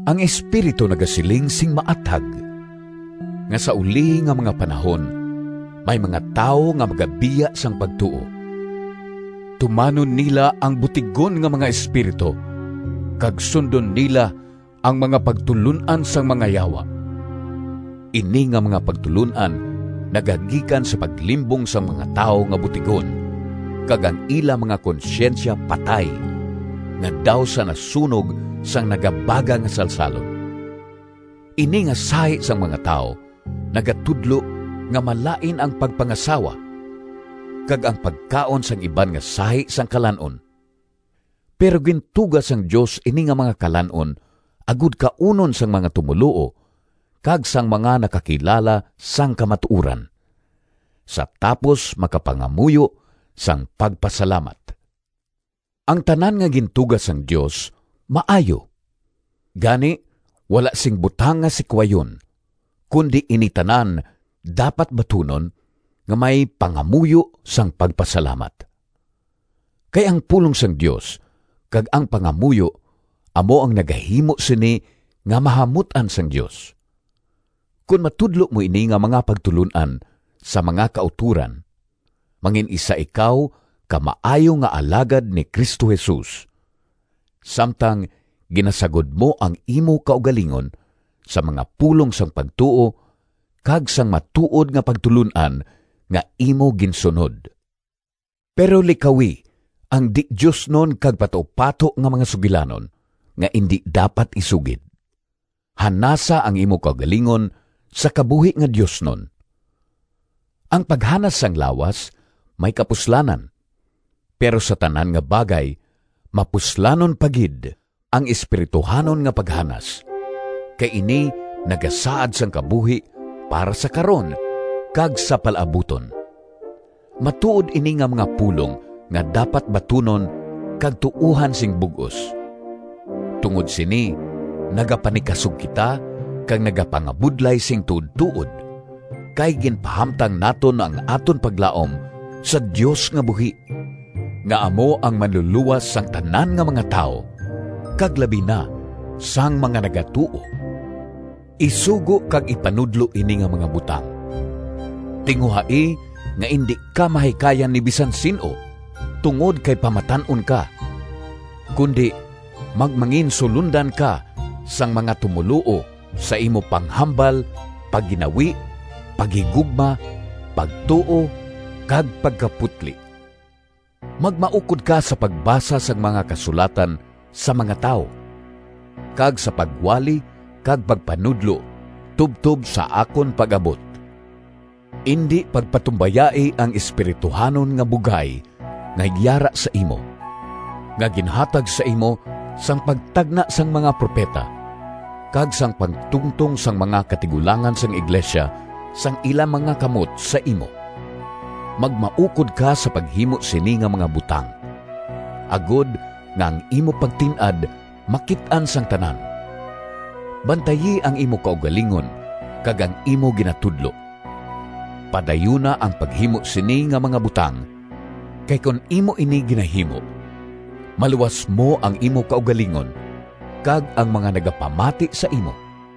Ang Espiritu nagasiling sing maathag nga sa ulihi nga mga panahon may mga tawo nga magabiya sang pagtuo. Tumanon nila ang butigon nga mga espiritu kag sundon nila ang mga pagtulon-an sang mga yawa. Ini nga mga pagtulon-an nagagikan sa paglimbong sang mga tawo nga butigon kag ang ila mga konsyensya patay, nga daw sa nasunog sang nagabaga nga salsalon. Ini nga sahi sang mga tawo nagatudlo nga malain ang pagpangasawa, kag ang pagkaon sang iban nga sahi sang kalan-on. Pero gintuga sang Dios ini nga mga kalan-on agod kaunon sang mga tumoluo kag sang mga nakakilala sang kamatuoran, sa tapos makapangamuyo sang pagpasalamat. Ang tanan nga gintuga sang Dios maayo. Gani wala sing butang nga sikwayon, kundi ini tanan dapat batunon nga may pangamuyo sang pagpasalamat. Kay ang pulong sang Dios kag ang pangamuyo amo ang nagahimo sini nga mahamut-an sang Dios. Kon matudlo mo ini nga mga pagtulon-an sa mga kautoran mangin-isa ikaw ka maayo nga alagad ni Cristo Jesus, samtang ginasagod mo ang imo kaugalingon sa mga pulong sang pagtuo kag sang matuod nga pagtulon-an nga imo ginsunod. Pero likawi ang di-diosnon kag patupato nga mga sugilanon, nga indi dapat isugid. Hanasa ang imo kaugalingon sa kabuhi nga diosnon. Ang paghanas sang lawas may kapuslanan, pero sa tanan nga bagay mapuslanon pa gid ang espirituhanon nga paghanas, kay ini nagasaad sang kabuhi para sa karon kag sa palaabuton. Matuod ini nga mga pulong nga dapat batunon kag tuohan sing bug-os. Tungod sini nagapanikasog kita kag nagapangabudlay sing tuodtuod, kay ginpahamtang naton ang aton paglaom sa Dios nga buhi, nga amo ang Manlulowas sang tanan nga mga tawo kag labi na sang mga nagatuo. Isugo kag ipanudlo ini nga mga butang. Tinguhai nga indi ka mahikayan ni bisan sin-o tungod kay pamatan-on ka, kundi magmanginsulondan ka sang mga tumoluo sa imo panghambal, pagginawi, paghigugma, pagtuo kag pagkaputli. Magmaukod ka sa pagbasa sang mga Kasulatan sa mga tawo, kag sa pagwali kag pagpanudlo tubtob sa akon pag-abot. Indi pagpatumbayai ang espirituhanon nga bugay nga yara sa imo, nga ginhatag sa imo sang pagtagna sang mga propeta kag sang pagtungtong sang mga katigulangan sang iglesia sang ila mga kamot sa imo. Magmaukod ka sa paghimo sini nga mga butang, agod nga ang imo pagtin-ad makit-an sang tanan. Bantayi ang imo kaugalingon kag ang imo ginatudlo. Padayuna ang paghimo sini nga mga butang, kay kon imo ini ginahimo, maluwas mo ang imo kaugalingon kag ang mga nagapamati sa imo.